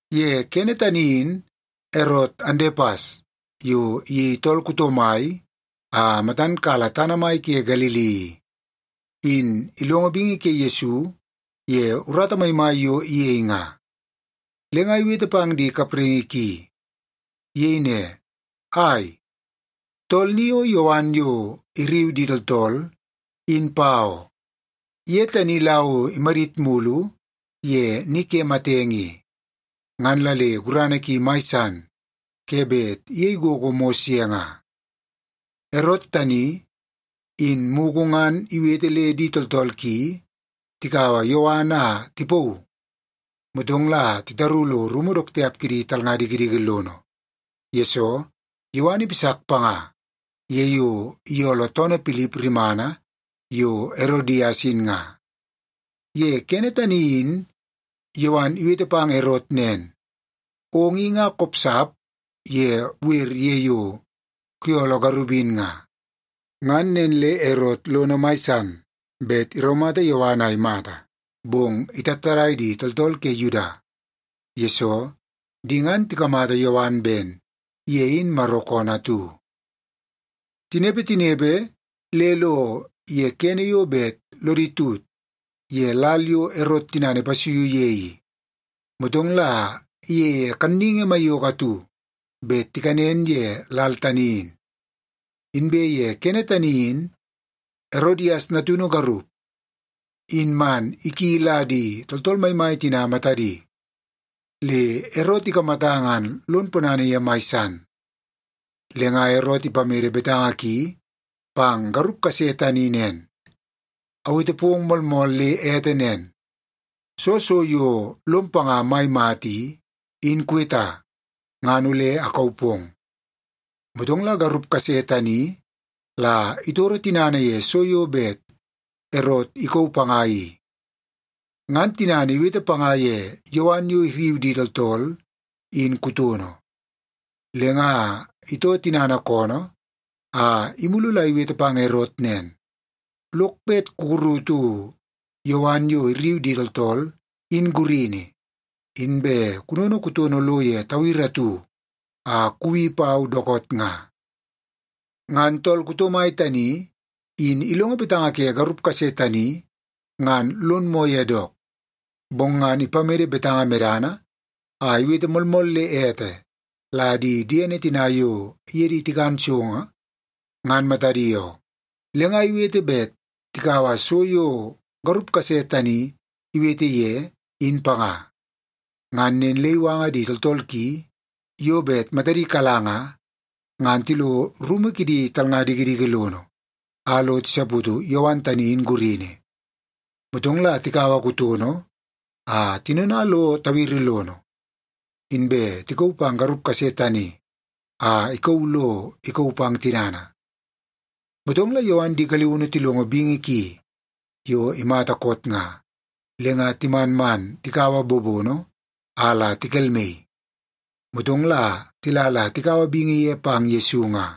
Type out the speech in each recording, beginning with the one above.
Ye kene tani in Erot Andepas yo iyei tool kuto mai a matan kala tana mai ke Galili i, in ilongo bingi ke Yesu ye urata maimai yo iyei nga, le nga iwete pang di kapraingi ki. Iyei ne, “Ai, tool ni o Yowan yo irriu di tooltool, in pa oo. Ye tani la o imadit mulu ye ni ke matenge i, ngan la le gurana ki mai san ke bet iyei gogo mos ye nga.” Erot tani, in mugu ngan iwete le di tooltool ki tikaua Yowan a tipauu, motong la titaru lo rumu dook tiap kidi talnga dikidiki lono, yesoo Yowan ipasak panga ye yo iyooloo toonoo Pilip rimana yo Erodias in nga. Ye kene tani in Yowan iwete pang Erot nen, “Ong i nga kopsap ye wer ye yo kuyooloo garup in nga.” Ngan nen le Erot lono mai san bet iraumata Yowan a imata, bong itattadai di tooltool ke Yuda, yesoo di ngan tikamata Yowan ben ye in Maro koonoo atu. Tinepe, tinepe, le tilo ye kene yo bet lodi tut ye lal yo Erot tinana ipasuiu ye i, motong la iyeie kanningi maiyoko atu bet tikanen ye lal tani in. Inbe ye kene tani in Erodias natunu garup, in man iki la di tooltool maimai tina matadi, le Erot ikamata ngan lon ponana ye mai san. Le nga Erot ipamede betanga ki pang garup kase tani nen, “Awete pong moolmool le ete nen. Soo so yo lom panga mai mata i, in kuweta, ngan ole akauu pong.” Motong la garup kase tani la itoro tinana ye so yo bet Erot ikauu panga i, ngan tinana iwete panga ye Yowan yo irriu di tooltool in kutono. Le nga itoo tinana koonoo a imulu la iwete pang Erot nen, “Lok bet kukurutu Yowan yo irriu di tooltool, in gurini, inbe kunono kutono lo ye tawiri atu a kuwi pau dookoot nga.” Ngan tool kuto mai tani in ilongo betanga ke garup kase tani ngan lon moo ye dook. Bong ngan ipamede betanga medana a iwete moolmool le ete la di diene tina yo iye di tikan so, ngan matadi oo, le nga iwete bet tikaua so yo garup kase tani iwete ye, in panga. Ngan nen le iwanga di tooltool ki yo bet matadi kala nga, ngan tilo rumu kidi talnga dikidiki lono a lo tisaputu Yowan tani in gurini. Motong la tikaua kutono a tinona lo tawiri lono, inbe tikauu pang garup kase tani a ikauu lo ikauu pang tinana. Motong la Yowan di galiunu tilongo bingi ki yo imata koot nga, le nga timan man tikaua bobono a la tikelmaii. Motong la tila la tikaua bingi ye pang Yesu nga.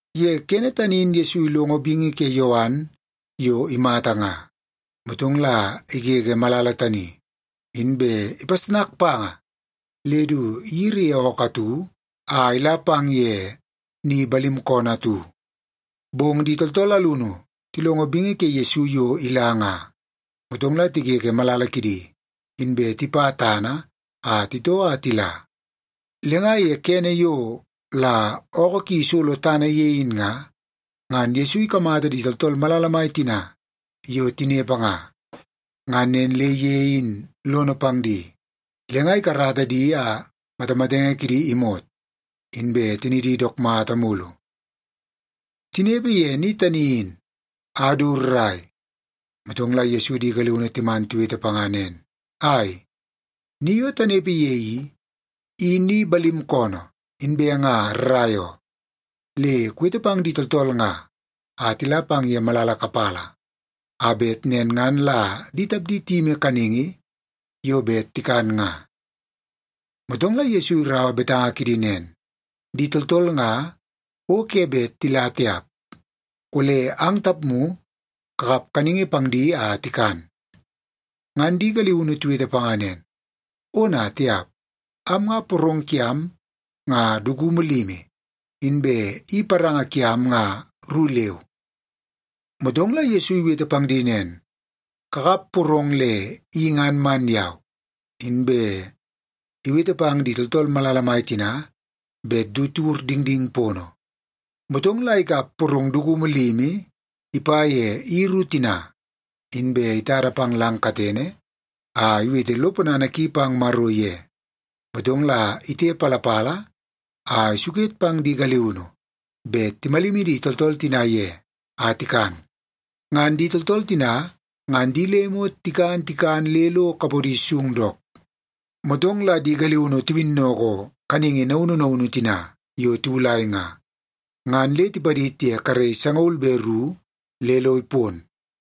Ye kene tani in Yesu ilongo bingi ke Yowan yo imata nga, motong la igege malala tani, inbe ipasnaka panga le du iyiri ye ookoo atu a ila pang ye ni balim koonoo atu. Bong di tooltool alunu tilongo bingi ke Yesu yo ila nga, motong la tigege malala kidi, inbe tipa tana a titoo a tila. Le nga ye kene yo la ookoo ki isolo tana ye in nga, ngan Yesu ikamata di tooltool malala mai tina yo tinepe nga. Ngan nen le ye in lono pang di, le nga ikarata di a matamatenge kidi imot, inbe tinidi dook mata mulu. Tinepe ye ni tani in a du rrai, motong la Yesu di galiunu timan tiwete panga nen, “Ai, ni yo tanepe ye i, i ni balim koonoo, inbe nga rrai oo. Le kuwete pang di tooltool nga a tila pang ye malala kapala, a bet nen ngan la di tapdi tiyimi kaningi yo bet tikan nga.” Motong la Yesu iraua betanga kidi nen, “Di tooltool nga o ke bet tila tiap. Ole ang tapmu kakap kaningi pang di a tikan.” Ngan di galiunu tiwete panga nen, “Ona tiap! Am nga porong kiam nga dukumu limi, inbe i paranga kiam nga ru leu.” Motong la Yesu iwete pang di nen, “Kakap porong le i ngan man yau.” Inbe iwete pang di tooltool malala mai tina bet du tiwur dingding pono. Motong la ikap porong dukumu limi ipa ye i ru tina, inbe itada pang lang katene a iwete lo ponana ki pang Maro ye. Motong la itepalapala a isuket pang di galiunu bet timalimi di tooltool tina ye a tikan. Ngan di tooltool tina ngan di le imot tikan tikan le lo kapodi sung dook. Motong la di galiunu tiwinnoko kaningi naunu naunu tina yo tiwulai nga, ngan le tipadid ye karei sangaul be ru le lo ipon.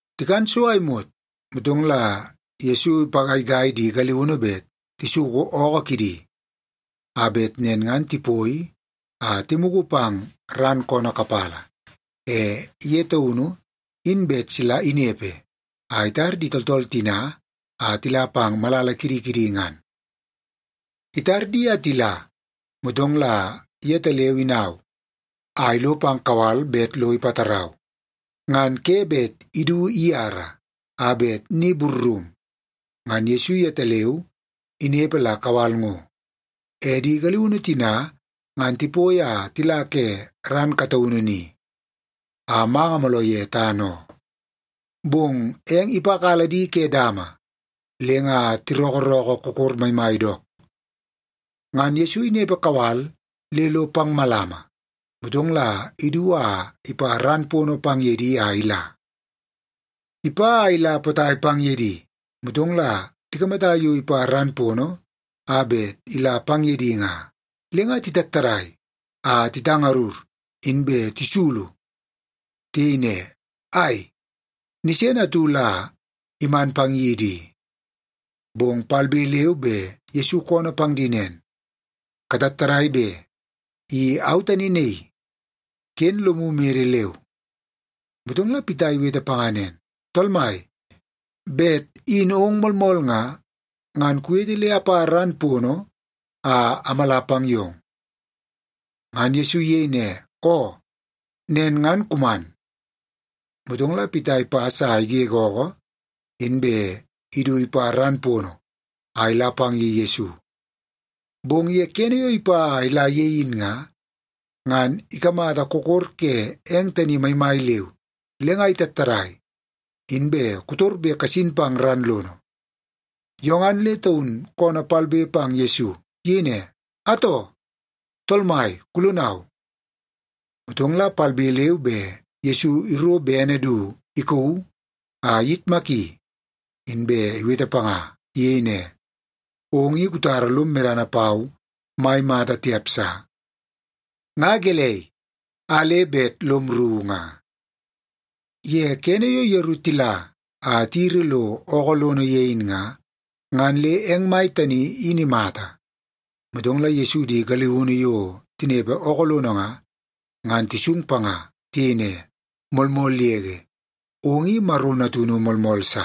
Tikan so a imot, motong la Yesu ipagaigai di galiunu bet tisuku ookoo kidi, a bet nen ngan tipoi a timugu pang ran koonoo kapala. E ye taunu in bet sila inepe a itar di tooltool tina a tila pang malala kidi kidi ngan. Itar di a tila, motong la yetaleu inau a ilo pang kawal bet lo ipatarau. Ngan ke bet idu iyara a bet ni burrum, ngan Yesu yetaleu inepe la kawal ngo. E di galiunu tina ngan tipoi a tila ke ran kataunu ni, a manga mooloo ye tana oo. Bong eng ipakala di ke dama le nga tirookoorookoo kokor maimai dook. Ngan Yesu inepe kawal le lo pang malama, motong la idu a ipa ran pono pang ye di a ila. Ipa a ila potai pang ye di, motong la tikamata yo ipa ran pono a bet ila pang ye di nga. Le nga titattadai a titangarur, inbe tisulu. Tiyei ne, “Ai, nisene atu la iman pang yidi i!” Bong palbe leu be Yesu koonoo pang di nen, “Katattadai be! I au tani naii. Ken lomu mede leu.” Motong la Pita iwete panga nen, “Tool Mai, bet in ong moolmool nga, ngan kuwete le apa ran pono a amala pang yong.” Ngan Yesu iyei ne, “Oo, nen ngan kuman.” Motong la Pita ipas a igege ookoo, inbe idu ipa ran pono a ila pang ye Yesu. Bong ye kene yo ipa a ila ye in nga, ngan ikamata kokor ke eng tani maimai leu, le nga itattadai, inbe kotorbe kasin pang ran lono. Yo ngan le taun koonoo palbe pang Yesu. Iyei ne, “Atoo, Tool Mai, kulonau!” Motong la palbe leu be Yesu iro bene du ikauu a iyitmaki, inbe iwete panga. Iyei ne, “Ong i kutara lom medana pau mai mata tiap sa! Nga gelei, a le bet lom rru nga?” Ye kene yo yeru tila a tiyiri lo ookoo lono ye in nga, ngan le eng mai tani in imata. Motong la Yesu di galiunu yo tinepe ookoo lono nga, ngan tisung panga. Tiyei ne, “Moolmool yege, ong i Maro Natunu moolmool sa.”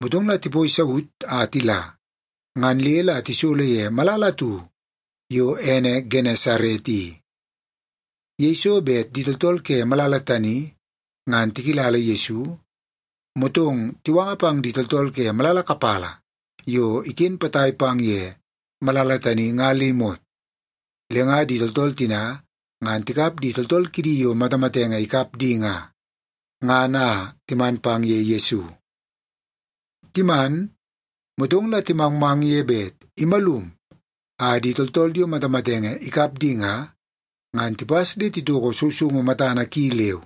Motong la tipoi saut a tila, ngan le la tisolo ye malala atu yo ene Genesaret i. Yeiso bet di tooltool ke malala tani ngan tikilala Yesu, motong tiwanga pang di tooltool ke malala kapala yo iken potai pang ye malala tani nga le imot. Le nga di tooltool tina ngan tikap di tooltool kidi yo matamatenge ikap di nga, ngan a timan pang ye Yesu. Timan, motong la timangmang ye bet imalum a di tooltool yo matamatenge ikap di nga, ngan tipas le titoko sousoungu matana ki leu,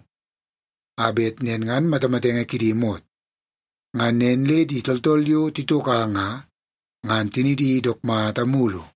a bet nen ngan matamatenge kidi imot. Ngan nen le di tooltool yo titoka nga, ngan tinidi dook mata mulu.